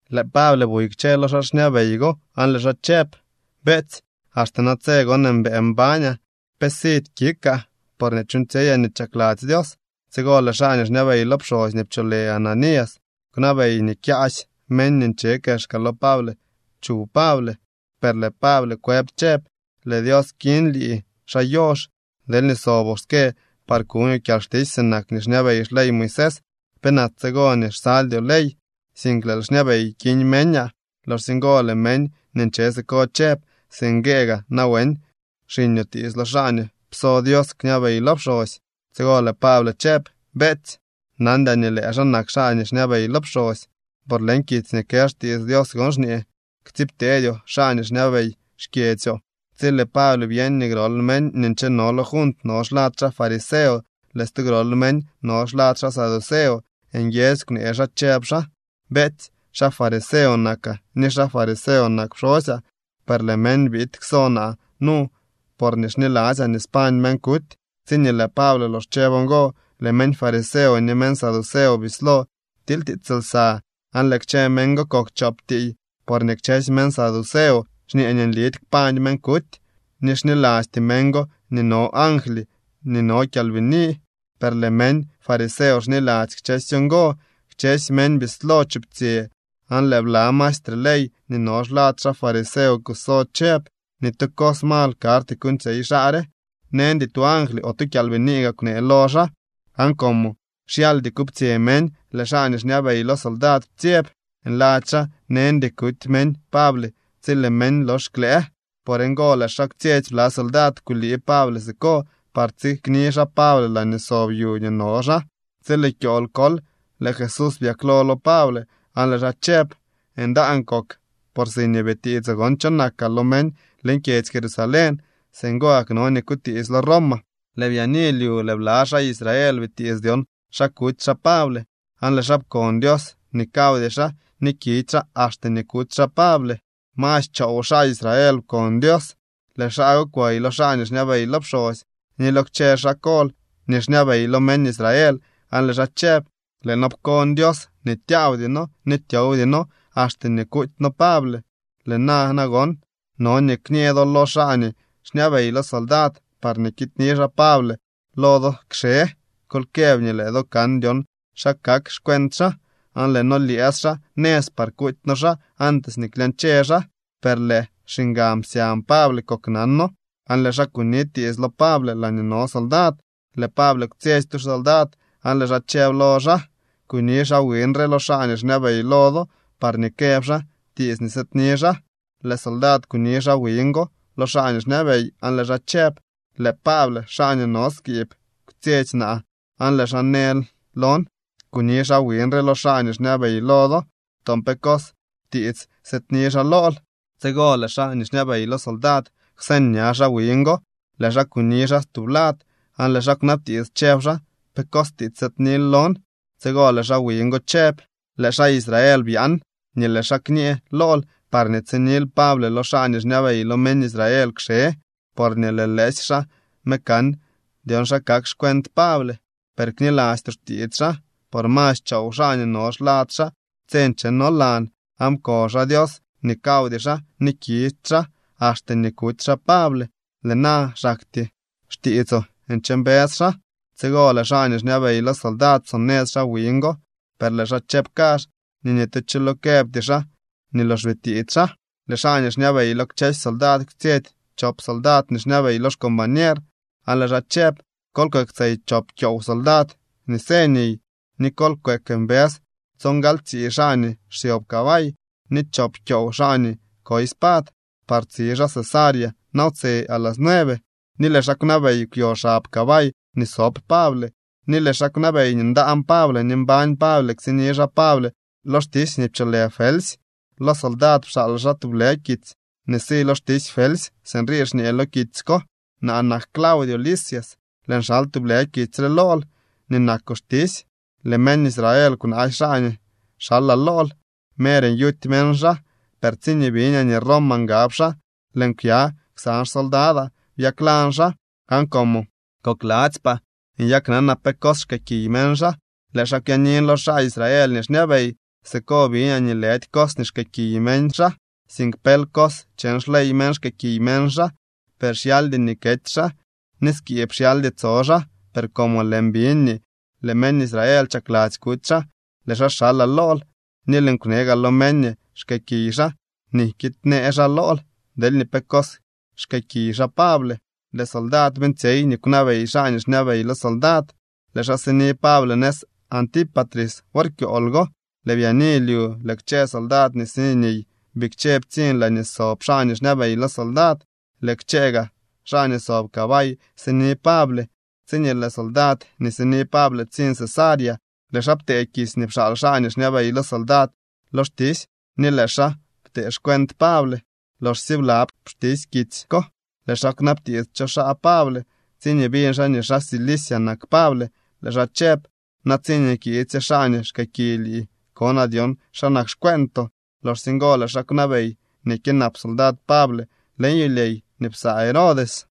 Lëë Pable buy kchë lo xaa xñabey go aan lëë xaa chëb: —Beetsy, axte natse gon mbëë mbañaa. Pe sidy kikaa porñee chuuñtsyeyaa nii chakladzy Dios. Tsigo lëë xaa nii xñabey lo pxosy nii pcholë Ananías kwnabey nii kyaasy meñ nii nche kexka lo Pable chuw Pable. Per lëë Pable kwëb chëb: —¡Lëë Dios kiñ lii, xaa yox! Deelñee soboo ske par kuñoo kyalxtisy sinak nii xñabey xley Moisés, ¿penak tsigo nii xsaldyoo ley, sink lëël xñabey kiñ meñaa? Loxsye ngo lëë meñ nii nche siko chëb: —¿Singuee gaa nawen xiñoo tiits lo xaa nii pso Dios kñabey lo pxosy? Tsigo lëë Pable chëb: —Beetsy, nandyaa nii lëë xaa nak xaa nii xñabey lo pxosy, por leñ kitsy nii kë xtiits Dios gon xñee: “Ktsiibteedyoo xaa nii xñabey xkyedzyoo.” Tsi lëë Pable byeñ nii grol meñ nii ncheno lo junt no xlad xaa fariseo, lëë stu grol meñ no xlad xaa saduceo, nguiedzy kwnee xaa, chëb xaa: —Beetsy, xaa fariseo nakaa ni xaa fariseo nak pxosyaa, per lëë meñ biid kso naa nu porñee xniladzyaa nii spañ meñ kuty. Tsiñee lëë Pable lox chëb ngo, lëë meñ fariseo ni meñ saduceo bislo ptilytiits lsa, aan lëë kchë meñ go kok chop tiiy. Porñee kchësy meñ saduceo xñee nii nlidy kpañ meñ kuty, ni xnilasty meñ go nii no angly ni no kyalbini. Per lëë meñ fariseo xniladzy kchësy ngo. Kchësy meñ bislo chuptsyë aan lëë bla maestre ley nii no xlad xaa fariseo kuso chëb: —Ni tu cos mal karty kuuñtsyey xaa re. Neñdy tu angly o tu kyalbinii gaa kwnee lo xaa. Aan como xyaldy kuptsyë meñ, lëë xaa nii xñabey lo soldad ptsyeb, nladzy xaa neñdy kuty meñ Pable tsi lëë meñ lox klëë. Por ngo lëë xaa kwtsyetsy bla soldad kulii Pable siko par tsikni xaa Pable laañee sob yu nii no xaa. Tsi lëë kyool kol lëë Jesús byaklo lo Pable aan lëë xaa chëb: —Ndaan kok, por siñee bitiitsoo gon cho nakaa lo meñ leñ kyedzy Jerusalén, singo gak no nii kutiitslo Roma. Lëë byaani lyu lëë bla xaa Israel bitiits dyon xa kuty xaa Pable, aan lëë xaa pkon Dios nii kawdy xaa ni kidy xaa axte nii kuty xaa Pable. Masy choow xaa Israel pkon Dios. Lëë xaa go kwey lo xaa nii xñabey lo pxosy ni lo kchë xaa kol nii xñabey lo meñ Israel aan lëë xaa chëb: —Lëë noo pkon Dios nii tyaawdy noo ni tyowdy noo axte nii kuuty noo Pable. Lëë na nagon, no nii kñee do lo xaa nii xñabey lo soldad parñee kiidni xaa Pable lo do kxe. Kol këb nii lëë do kan dyon xa kak xcuent xaa, aan lëë noo lyëës xaa nëz par kuuty noo xaa antes nii klyañche xaa. Per lëë xiñgan psyañ Pable koknano aan lëë xaa kuni tiits lo Pable laañee no soldad. Lëë Pable kwtsyetsy tu soldad aan lëë xaa chëb lo xaa: —Kuni xaa wiñ re lo xaa nii xñabey lo do, parñee këb xaa tiits nii sëëdni xaa. Lëë soldad kuni xaa wiñ go lo xaa nii xñabey aan lëë xaa chëb: —Lëë Pable, xaa nii no skiib kwtsyetsy naa aan lëë xaa në lon: Kuni xaa wiñ re lo xaa nii xñabey lo do. Toon pe cos tiits sëëdni xaa lool. Tsigo lëë xaa nii xñabey lo soldad kwseñ ña xaa wiñ go, lëë xaa kuni xaa tublad, aan lëë xaa kwnabtiits, chëb xaa: —¿Pe cos tiits sëëdnil lon? Tsigo lëë xaa wiñ go chëb: —Lëë xaa Israel byaan nii lëë xaa kñee lool parñee tsinil Pable lo xaa nii xñabey lo meñ Israel kxe, porñee lëë lëësy xaa me kan dyon xa kak xcuent Pable. Per knilastyoo xtiits xaa, por masy choow xaa nii no xlad xaa tse nchenolan, aan pkon xaa Dios nii kawdy xaa ni kidy xaa axte nii kuty xaa Pable. Lëë na xaktyee xtiitsoo nche mbës xaa. Tsigo lëë xaa nii xñabey lo soldad psonëz xaa wiñ go, per lëë xaa chëb kazh nii ni tu cho lo këbty xaa nii lox bitiits xaa. Lëë xaa nii xñabey lo kchësy soldad kwtsyetsy chop soldad nii xñabey lo xcombañer, aan lëë xaa chëb: —Kol kweektsey chop kyoow soldad nii së niy, ni kol kweek mbës tsongaltsii xaa nii xsyob cabay, ni chop kyoow xaa nii koy spad, par tsi xaa Cesarea nawtse a las nueve. Ni lëë xaa kwnabey kwyo xab cabay nii sob Pable, ni lëë xaa kwnabey nii ndaan Pable ni mbañ Pable ktsiñni xaa Pable lo xtisy nii pcholë Felsy. Lo soldad pxaal xaa tublë kitsy nii si lo xtisy Felsy. Sinrii xñee lo kitsy ko: “Naa nak Claudio Lisias. Lëën xal tublë kitsy re lool nii nakoo xtisy. Lëë meñ Israel kwnaasy xaa nii xalaa lool, mer nyuty meñ xaa, per tsiñee biñaa nii Roma ngab xaa, lëën kwya ksan xsoldadaa, byaklan xaa. Aan como kokladzypaa nyaknanaa pe cos xkëëkiy meñ xaa, lëë xaa kwyaanin lo xaa Israel nii xñabey. Siko biñaa nii lëdy cos nii xkëëkiy meñ xaa, sink pel cos cheñ xley meñ xkëëkiy meñ xaa. Per xyaldy nii kety xaa, ni skiib xyaldy tso xaa. Per como lëën biñ nii lëë meñ Israel chakladzy kuty xaa, lëë xaa xalaa lool ni lëën kwne gaa lo meñ nii xkëëkiy xaa nii kiidnee xaa lool deelñee pe cos xkëëkiy xaa Pable.” Lëë soldad beeñtsyey nii kwnabey xaa nii xñabey lo soldad. Lëë xaa sini Pable nëz Antípatris wor kyool go. Lëë byaani lyu lëë kchë soldad nii si niy bikche ptsiñ laañee sob xaa nii xñabey lo soldad. Lëë kchë gaa xaa nii sob cabay sini Pable. Tsiñee lëë soldad nii sini Pable ptsiñ Cesarea, lëë xaa ptee kitsy nii pxaal xaa nii xñabey lo soldad lo xtisy ni lëë xaa ptee xcuent Pable. Loxsye blab xtisy kitsy ko, lëë xaa kwnabtiits cho xaa Pable. Tsiñee biñ xaa nii xaa Cilicia nak Pable, lëë xaa chëb: —Na tsiñee kiidsye xaa nii xkëëkiy lii konaa dyon xa nak xcueentoo. Loxsye ngo lëë xaa kwnabey nii kyënap soldad Pable leñ yulyey nii psaa Herodes.